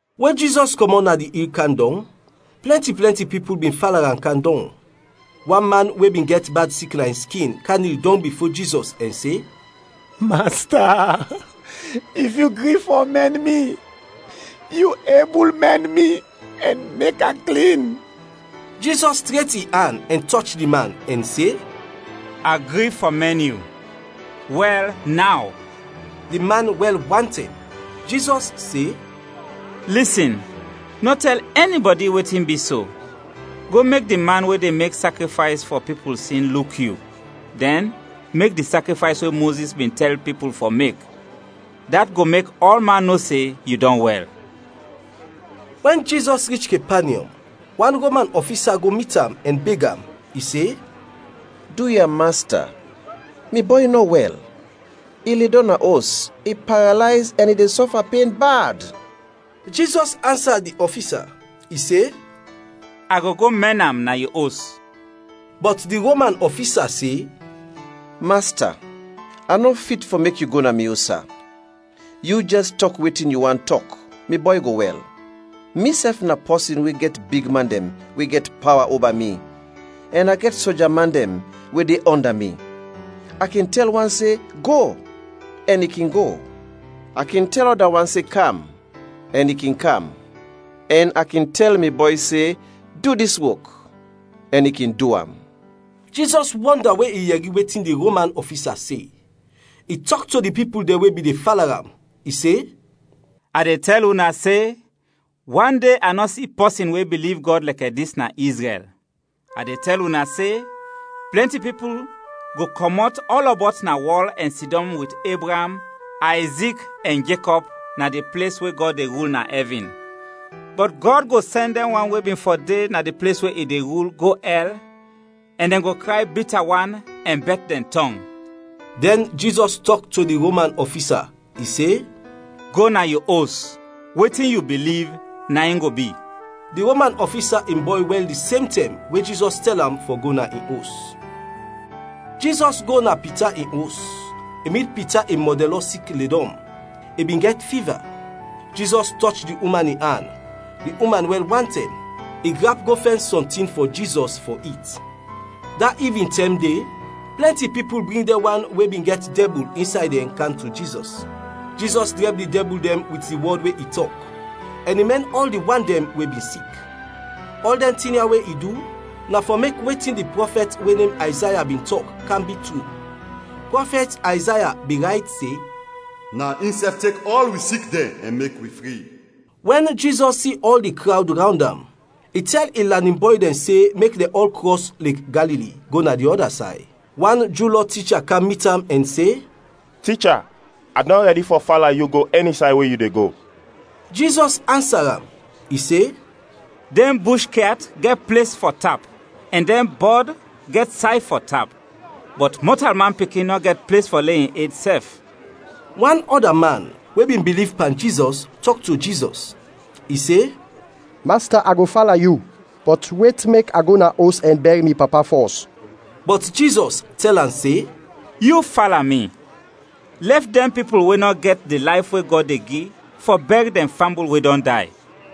We Jizɔs kɔmɔt na di il kam dɔng, plɛnti plɛnti pipul bin fala am kam dɔng. Wan man we bin gɛt bad sik na in skin, kam nil dɔng bifo Jizɔs ɛn se, “Masta, if yu gri fɔ mɛn mi, yu ebul mɛn mi ɛn mek a klin.” Jizɔs tret in an ɛn tɔch di man ɛn se, “A gri fɔ mɛn yu. Wɛl naw!” Di man wɛl wantɛm. Jizɔs se, “Lisin, nɔ tɛl ɛnibɔdi wetin bi so, go mek di man we de mek sakrifays fɔ pipul sin luk yu; dɛn, mek di sakrifays we Mozis bin tɛl pipul fɔ mek. Dat go mek ɔlman no se yu dɔn wɛl.” Wɛn Jizɔs rich Kepanyɔm, wan Roman ɔfisa go mit am ɛn beg am. I se, “Duya, Masta, mi bɔy nɔ wɛl, i ledɔm na os, i paralayz ɛn i de sɔfa pen bad.” Jizɔs ansa di ɔfisa. I se, “A go go mɛn am na yu os.” Bɔt di Roman ɔfisa se, “Masta, a nɔ fit fɔ mek yu go na mi os, sa. Yu jɛs tɔk wetin yu want tɔk, mi bɔy go wɛl. Misɛf na pɔsin we gɛt bigman dɛn we gɛt pawa oba mi ɛn a gɛt soja man dɛn we dɛn de ɔnda mi. A kin tɛl wan se, ‘Go!’ ɛn i kin go; a kin tɛl ɔda wan se, ‘Kam!’ ɛn i kin kam; ɛn a kin tɛl mi bɔy se, ‘Du dis wok!’ ɛn i kin du am.” Jizɔs wɔnda we i yɛri wetin di Roman ɔfisa se, i tɔk to di pipul dɛn we bin de fala am. I se, “A de tɛl una se, wande a nɔ si pɔsin we biliv Gɔd lɛkɛ dis na Izrɛl. A de tɛl una se, plɛnti pipul go kɔmɔt ɔlɔbɔt na wɔl ɛn sidɔm wit Ebraam, Ayzik ɛn Jekɔb na di ples we Gɔd de rul na ɛvin. Bɔt Gɔd go sɛn dɛn wan we bin fɔ de na di ples we i de rul, go ɛl, ɛn dɛn go kray bita wan ɛn bɛt dɛn tɔng.” Dɛn Jizɔs tɔk to di Roman ɔfisa, i se, “Go na yu os, wetin yu biliv, na in go bi.” Di Roman ɔfisa in bɔy wɛl di sem tɛm we Jizɔs tɛl am fɔ go na in os. Jizɔs go na Pita in os, i mit Pita in mɔdɛnlɔ sik ledɔm, i bin gɛt fiva. Jizɔs tɔch di uman in an, di uman wɛl wantɛm, i grap go fɛn sɔntin fɔ Jizɔs fɔ it. Da ivintɛm de, plɛnti pipul bring dɛn wan we bin gɛt dɛbul insay dɛn kam to Jizɔs. Jizɔs drɛb di dɛbul dɛn wit di wɔd we i tɔk, ɛn i mɛn ɔl di wan dɛn we bin sik. Ɔl dɛn tin ya we i du, na fɔ mek wetin di prɔfɛt we nem Ayzaya bin tɔk, kam bi tru. Prɔfɛt Ayzaya bin rayt se, “Na insɛf tek ɔl wi sik dɛn ɛn mek wi fri.” Wɛn Jizɔs si ɔl di krawd rawnd am, i tɛl in lanin bɔy dɛn se mek dɛn ɔl krɔs Lek Galili, go na di ɔda say. Wan Ju Lɔ ticha kam mit am ɛn se, “Ticha, a dɔn rɛdi fɔ fala yu go ɛni say we yu de go.” Jizɔs ansa am, i se, “Dɛn bush kyat gɛt ples fɔ tap, ɛn dɛn bɔd gɛt say fɔ tap; bɔt Mɔtalman Pikin nɔ gɛt ples fɔ le in ed sɛf.” Wan ɔda man, we bin biliv pan Jizɔs, tɔk to Jizɔs, i se, “Masta, a go fala yu, bɔt wet mek a go na os ɛn bɛr mi papa fɔs.” Bɔt Jizɔs tɛl am se, “Yu fala mi, lɛf dɛn pipul we nɔ gɛt di layf we Gɔd de gi fɔ bɛr dɛn fambul we dɔn day.”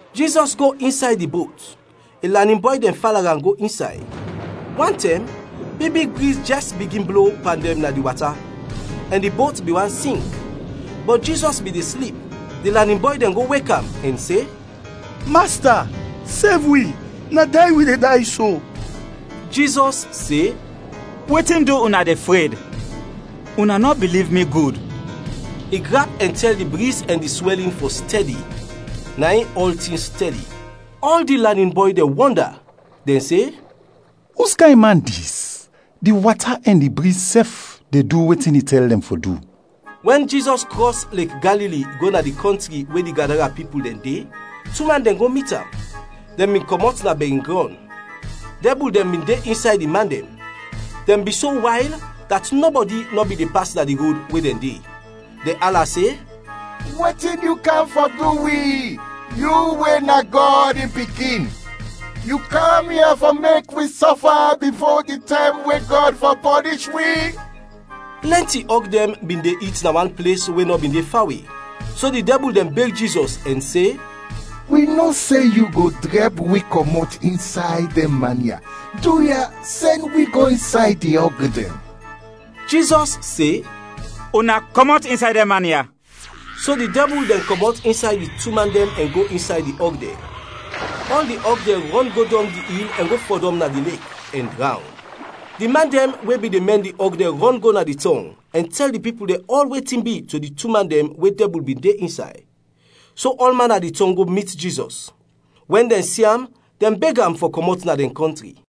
Jizɔs go insay di bot, in lanin bɔy dɛn fala am go insay. Wantɛm, big big briz jɛs bigin blo pan dɛn na di wata, ɛn di bot bin want sink, bɔt Jizɔs bin de slip. Di lanin bɔy dɛn go wek am ɛn se, “Masta, sev wi, na day wi de day so!” Jizɔs se, “Wetin du una de fred? Una nɔ biliv mi gud!” I grap ɛn tɛl di briz ɛn di swɛlin fɔ stɛdi, na in ɔltin stɛdi. Ɔl di lanin bɔy dɛn wɔnda, dɛn se, “Uskayn man dis? Di wata ɛn di briz sɛf de du wetin i tɛl dɛn fɔ du!” Wɛn Jizɔs krɔs Lek Galili go na di kɔntri we di Gadara pipul dɛn de, tu man dɛn go mit am, dɛn bin kɔmɔt na bɛringrɔn. Dɛbul dɛn bin de insay di man dɛn; dɛn bin so wayl, dat nɔbɔdi nɔ bin de pas na di rod we dɛn de. Dɛn ala se, “Wetin yu kam fɔ du wi, yu we na Gɔd in Pikin? Yu kam ya fɔ mek wi sɔfa bifo di tɛm we Gɔd fɔ pɔnish wi?” Plɛnti ɔg dɛn bin de it na wan ples we nɔ bin de fawe. So di dɛbul dɛn beg Jizɔs ɛn se, “Wi no se yu go drɛb wi kɔmɔt insay dɛn man ya, duya, sɛn wi go insay di ɔg dɛn.” Jizɔs se, “Una kɔmɔt insay dɛn man ya!” So di dɛbul dɛn kɔmɔt insay di tu man dɛn ɛn go insay di ɔg dɛn. Ɔl di ɔg dɛn rɔn go dɔng di il ɛn go fɔdɔm na di lek, ɛn drawn. Di man dɛn we bin de mɛn di ɔg dɛn rɔn go na di tɔng, ɛn tɛl di pipul dɛn ɔl wetin bi to di tu man dɛn we dɛbul bin de insay. So ɔlman na di tɔng go mit Jizɔs. Wɛn dɛn si am, dɛn beg am fɔ kɔmɔt na dɛn kɔntri.